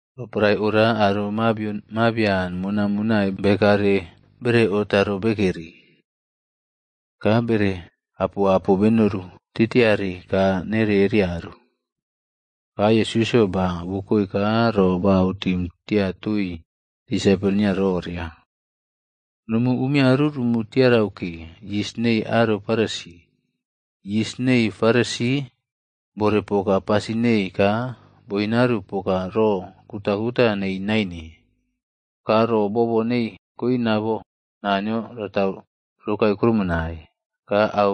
Roporae oria aro mabion mabian monaꞌmonai bekare bereꞌotaro bekeri, ka bere apoꞌapo benoru titiare kaa nere erearu. Ka Yesusꞌyo ba wokoe ka ro ba autim tia toii disaipol nio roria, “Nomu umiaru rumu tiarau ke, yis nei aro Farisi. Yis nei Farisi bore poka pasin nei ka boinearu poka ro kutakuta nei naine. Ka ro boobo nei koina bo Naniyo ratau rokae krumonai. Ka au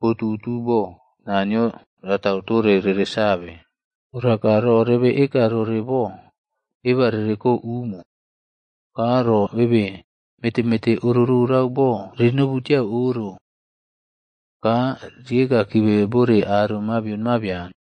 botutu bo Naniyo ratau tore rere save. Ora ka ro rebe eka roro bo, eba rereko umo. Ka ro bebe meteꞌmete oro rorau bo rinobu tiau oro ka rieka kibe bore aro mabion mabian.”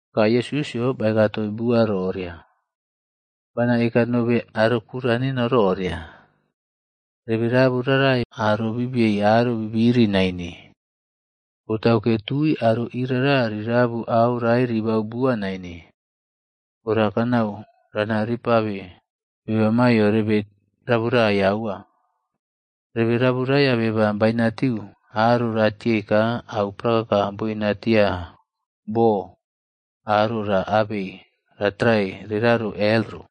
Ka Yesusꞌyo baeka toii bua roria, “Bana eka nobe aro kura neno roria, rebe rabu rarai aro bibiei aro bibiri naine.a Botauke tui aro irara rinabiu au rae ribau bua naine. Ora kanau rana ripabe beba maiyo rebe raburaiya aua. Rebe raburaiya beba bainatiu aro ratiei ka au prakaka boinatia bo aro ra abei ratrae reraro hel ro.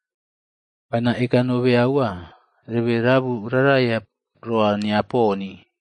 Bana eka nobe aua, rebe rabu raraya roa nia poni.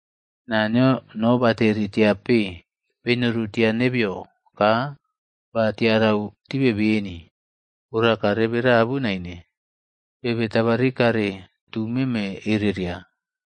Naniyo nobateri tiape benori tia nebeyo ka ba tiarau tibe beni. Ora ka rebe rabu naine, bebe tabaꞌrikare tu meme ereria.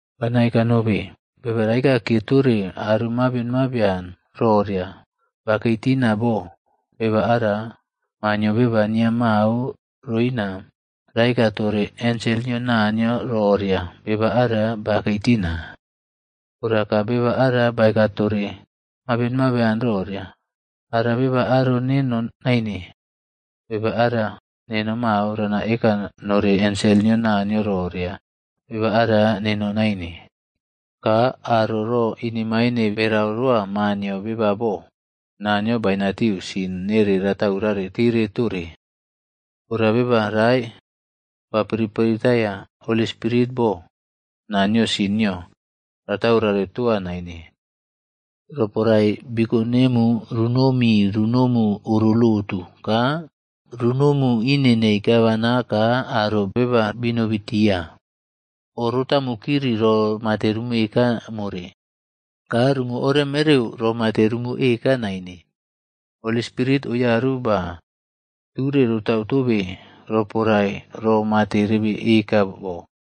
“Bana eka nobe, beba raekaꞌkiye tore aro mabion mabian roria bakei tina bo, beba ara Maa nio Beba nia mao roina raeka tore ensel nio Naniyo roria beba ara bakei tina. Ora ka beba ara baeka tore mabion mabian roria, ara beba aro neno naine, beba ara neno mao rana eka nore ensel nio Naniyo roria beba ara neno naine. Ka aro ro inemaine berau roa Maa nio Beba bo, Naniyo bainatiu sin nere rataurare tire tore. Ora beba rae ba piriꞌpiriꞌtaiya Holi Spirit bo, Naniyo sin nio rataurare toa naine. “Roporae biko nemu runomi runomu oro lotu ka runomu ine nei aro gavman ka aro beba binobitia, o rotamu kiri ro mate rumu eka more, ka rumu oreꞌmereu ro mate rumu eka naine. Holi Spirit oyaru ba ture rotau tobe roporae ro mate rebe eka bo.”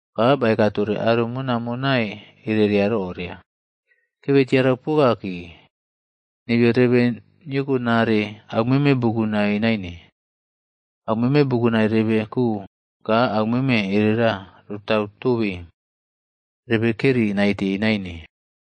Ka baeka tore aro monai monai erera roria, “Kebe tiarau poka ke. Nebeyo rebe niyokonaꞌre aumeme bukunai naine. Au meme bukunai rebe ko ka aumeme erera rotau tobe rebe keri naite naine.”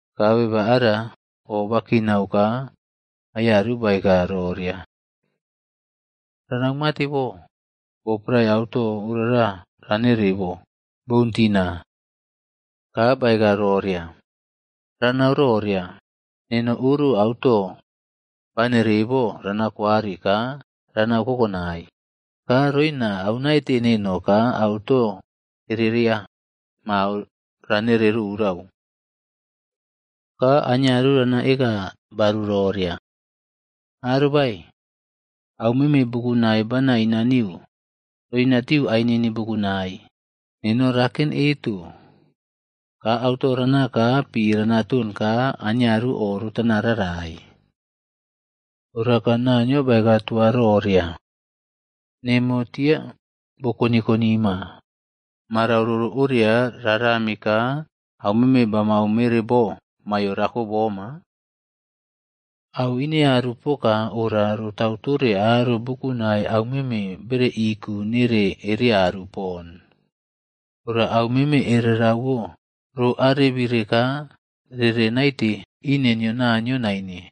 Ka beba ara o bakinau ka aiyaru baeka roria, ‘Ranau mate bo? Bo prae auto orara ranere bo, boun tina.’ “Ka baeka roria, ‘Ranau roria, neno oro auto banere bo ranakwari ka ranau kokonai. Ka roina aunaite neno ka auto ereria mao ranere rorau. Ka aniaru rana eka baru roria, “Arobae, aumeme bukunai bana inaniu roinatiu ainini bukunai. Neno raken eto, ka auto rana ka pi rana ton ka aniaru o rotana rarai.” ’ “Ora ka Naniyo baeka toa roria, ‘Nemo tia bo koniꞌkoni ma, Marau roro oria rarami ka aumeme bamau mere bo maiyo rako boma?’ “Auꞌinearu poka ora rotau tore aro bukunai aumeme bereꞌiku nere ereꞌaru pon, ora au meme erereꞌwo ro arebire ka rere naite ine nio Naniyo naine.”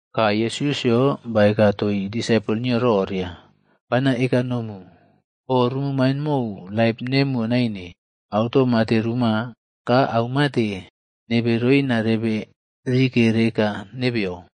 Ka Yesusꞌyo baeka toii disaipol nio roria, “Bana eka nomu, o rumu main mou laip nemuwo naine, auto mate ruma, ka aumate nebe roina rebe rike reka nebeyo.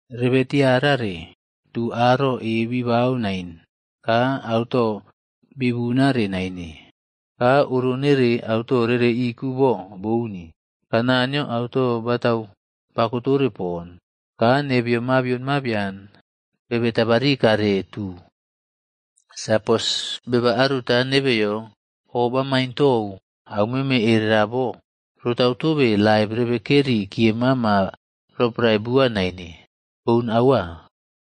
Rebe tiarare, tu aro e bibau nain ka auto bibunare naine. Ka oro nere auto rere iku bo bouni, ka Naniyo auto batau bakotore pon. Ka nebeyo mabion mabian, bebe tabari kare tu. Sapos beba aruta nebeyo oꞌbamain tou aumeme erera bo, rotau tobe laip rebekeri kiye mama roporae bua naine. Boun aua.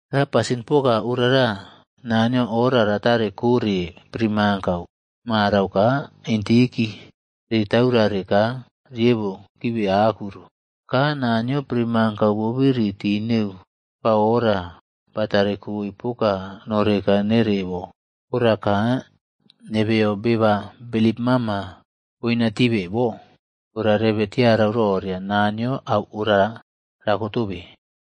Ka pasin poka orara Naniyo ora ratare kore primankau marau ka intiki ri taurare ka riebo kibe aku ro. Ka Naniyo primankau bobiri tii neu ba oora batare koe poka noreka nere bo, ora ka nebeyo beba bilip mama boina tibe bo, ora rebe tiarau roria Naniyo auꞌora rakotobe.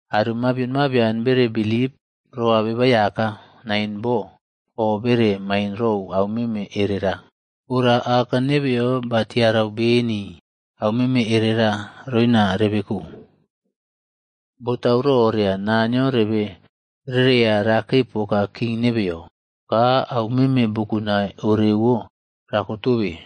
Aro mabion mabian bere bilip roa Beba Aiyaka nain bo o bere main rou aumeme erera. Ora Aka nebeyo batiarau beni aumeme erera roina rebe ko. Botau roria Naniyo rebe rereya rakei poka king nebeyo. Ka aumeme bukunai orewo rako tobe.”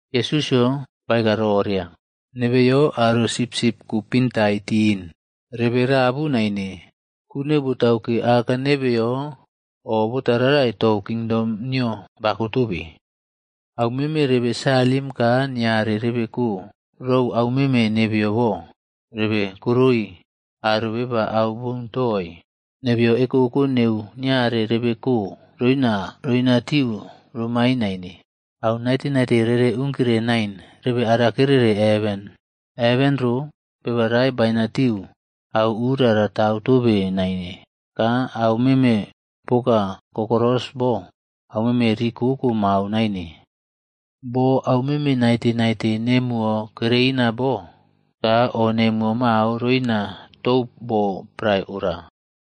Yesusꞌyo baeka roria, “Nebeyo aro sipsipb kupintai tin, rebe rabu naine, ku neu botauke aka nebeyo o botaꞌrarai tou kingdom nio bakotobe. Au meme rebe salim ka niare rebe ko rou aumeme nebeyo bo, rebe koroi aro beba au boun toii. Nebeyo ekoko neu niare rebe ko roina roinatiu romain naine. Au naite naite rere unkire nain rebe arakereꞌre heven. Heven ro, beba rae bainatiu auꞌura ratau tobe naine ka au meme poka kokoros bo aumeme rikoko mao naine. Bo aumeme naite naite nemuwo kereina bo, ka o nemuwo mao roina tou bo prae ora.”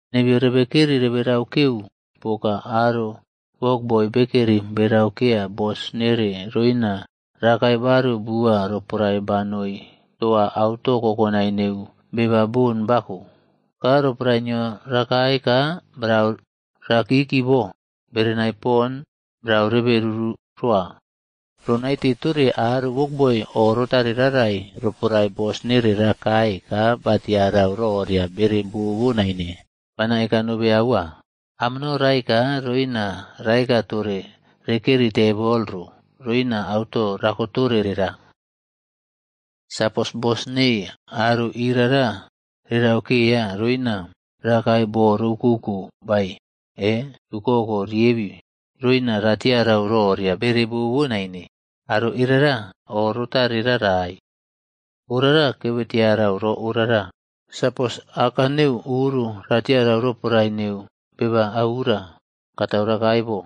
Nebeyo rebekeri rebe raukeu poka aro wokboi bekeri beraukeya bos nere roina rakae baru bua roporae banoi toa auto kokonai neu beba bon bako. Ka roporae nio rakae ka brau rakiki bo berenai pon brau rebe ruru roa. Ronaite tore aro wokboi o rotare rarai roporae bos nere rakae ka batiarau roria bere bobo naine. Bana eka nobe aua, amono raeka roina raeka tore rekeri tebol ro roina auto rako tore rera. Sapos bos neii aro irara rerauꞌkeya roina rakae bo roꞌukouko bae e tukoko riebi roina ratiarau roria bere bobo naine, aro erera o rotare rarai.” “Orara kebe tiarau ro orara, sapos aka neu oro ra tiarau roporae neu beba auura katau rakae bo,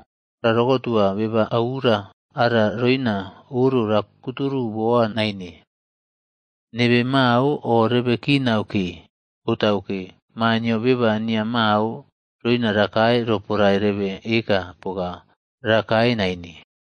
ra rokotua beba auura ara roina oro rakuturu boa naine. Nebe mao o rebe kinau ke, botauke, Maa nio Beba nia mao roina rakae roporae rebe eka poka rakae naine.”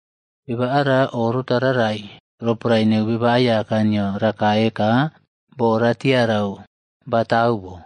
Beba ara o rotararai roporae neu beba aiyaka nio rakae ka boo ratiarau batau bo.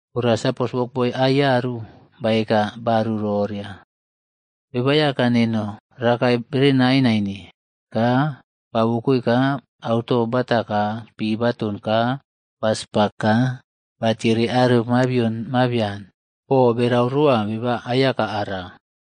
Ora sapos wokboi aiyaru baeka baru roria, ‘Beba Aiyaka neno rakae berenai naine.’ Ka ba wokoe ka auto bata ka pi baton ka ba spak ka batiere aro mabion mabian bo berau roa beba aiyaka ara.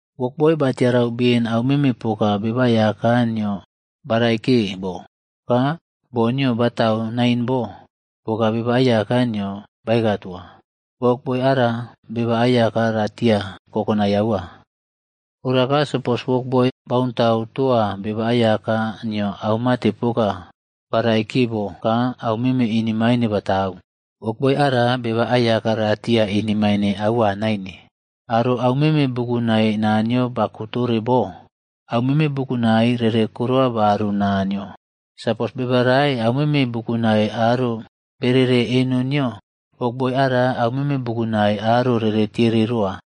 “Wokboi batiarau ben aumeme poka beba aiyaka nio baraikiye bo ka boo nio batau nain bo poka beba aiyaka nio baeka toa, wokboi ara beba aiyaka ratia kokonai aua. Ora ka sapos wokboi bauntau toa beba aiyaka nio aumate poka ba raikiye bo ka aumeme inemine batau, wokboi ara, beba aiyaka ratia inemaine aua naine. Aro aumeme bukunai Naniyo bako tore bo, aumeme bukunai rere korowa baru Naniyo. Sapos beba rae aumeme bukunai aro berere eno nio, wokboi ara aumeme bukunai aro rere tiere roa.”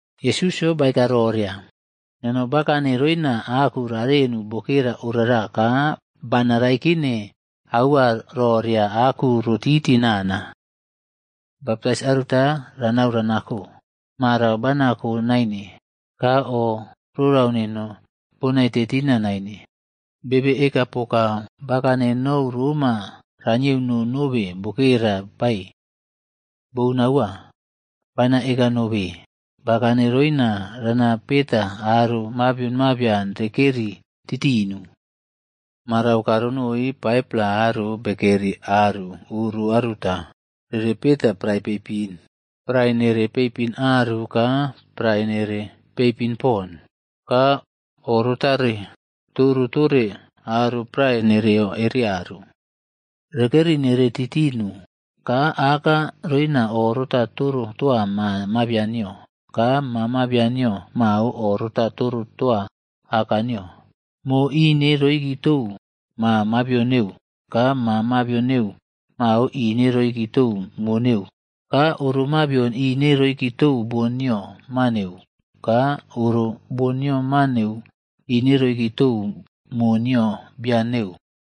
Yesusꞌyo baeka roria, “Neno bakane roina aku rarenu bokera orara ka bana raikine aua roria aku ro titi nana. Baptais aruta ranau ranako.c Marau bana ko naine, ka o rorau neno bonaite tina naine. Bebe eka poka bakane nou roma ranieuno nobe bokera bae? Boun aua! Bana eka nobe, bakane roina rana peta aro mabion mabian rekeri titinu. Marau ka ronoi 5-pla aro bekeri aru oro aruta rere peta prae peipin. Prae nere peipin aru ka prae nere peipin pon. Ka oꞌrotare toro tore aro prae nereyo ereꞌaru. Rekeri nere titinu ka aka roina oꞌrota toro toa ma mabian nio ka ma mabian nio mao o rota toro toa aka nio. Mo ine roꞌiki tou ma mabion neu ka ma mabion neu mao ine roiki tou mo neu, ka oro mabion ine roiki tou bon nio ma neu, ka oro bon nio ma neu ine roiki tou mo nio bian neu.”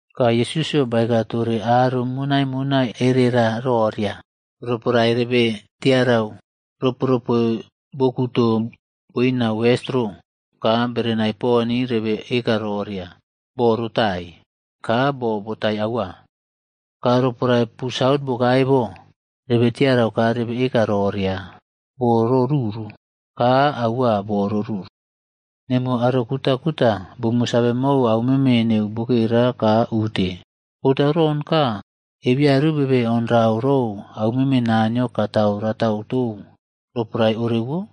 Ka Yesusꞌyo baeka tore aro monaiꞌmonai erera roria, “Roporae rebe tiarau ropoꞌropoe bo kuto boina wes ro, ka berenai pon rebe eka roria, ‘Bo ro tai,’ ka bo botai aua. Ka roporae pu saut bokae bo, rebe tiarau ka rebe eka roria, ‘Bo ro ruru,’ ka aua bo boruru. Nemuwo aro kutakuta bumu save mou aumeme neu bokera, ka ute. Botau ron ka ebeyaru bebe onrau rou aumeme Naniyo katau ratau tou roporae orewo?”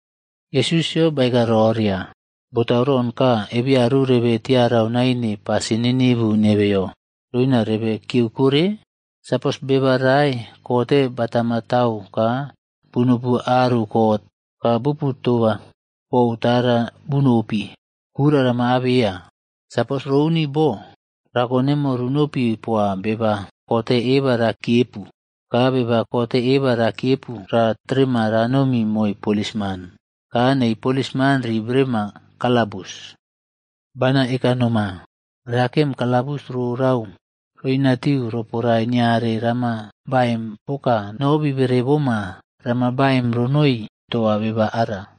Yesusꞌyo baeka roria, “Botau ron ka ebeyaru rebe tiarau naine pasin ninivu nebeyo roina rebe kiyeu kore? Sapos beba rae kote batama tau ka bunopi aru kot, ka bupu toba pou tara bunopi, kura rama abeya. Sapos rouni bo, rako nemo runopi poa beba kote eba rakiyepu. Ka beba kote eba rakiyepu ra terema ranomi moi polisman ka nei polisman ri berema kalabus. Bana eka noma, rakem kalabus rorau roinatiu roporae niare rama baim poka no bibere boma rama baim ronoi toa beba ara.”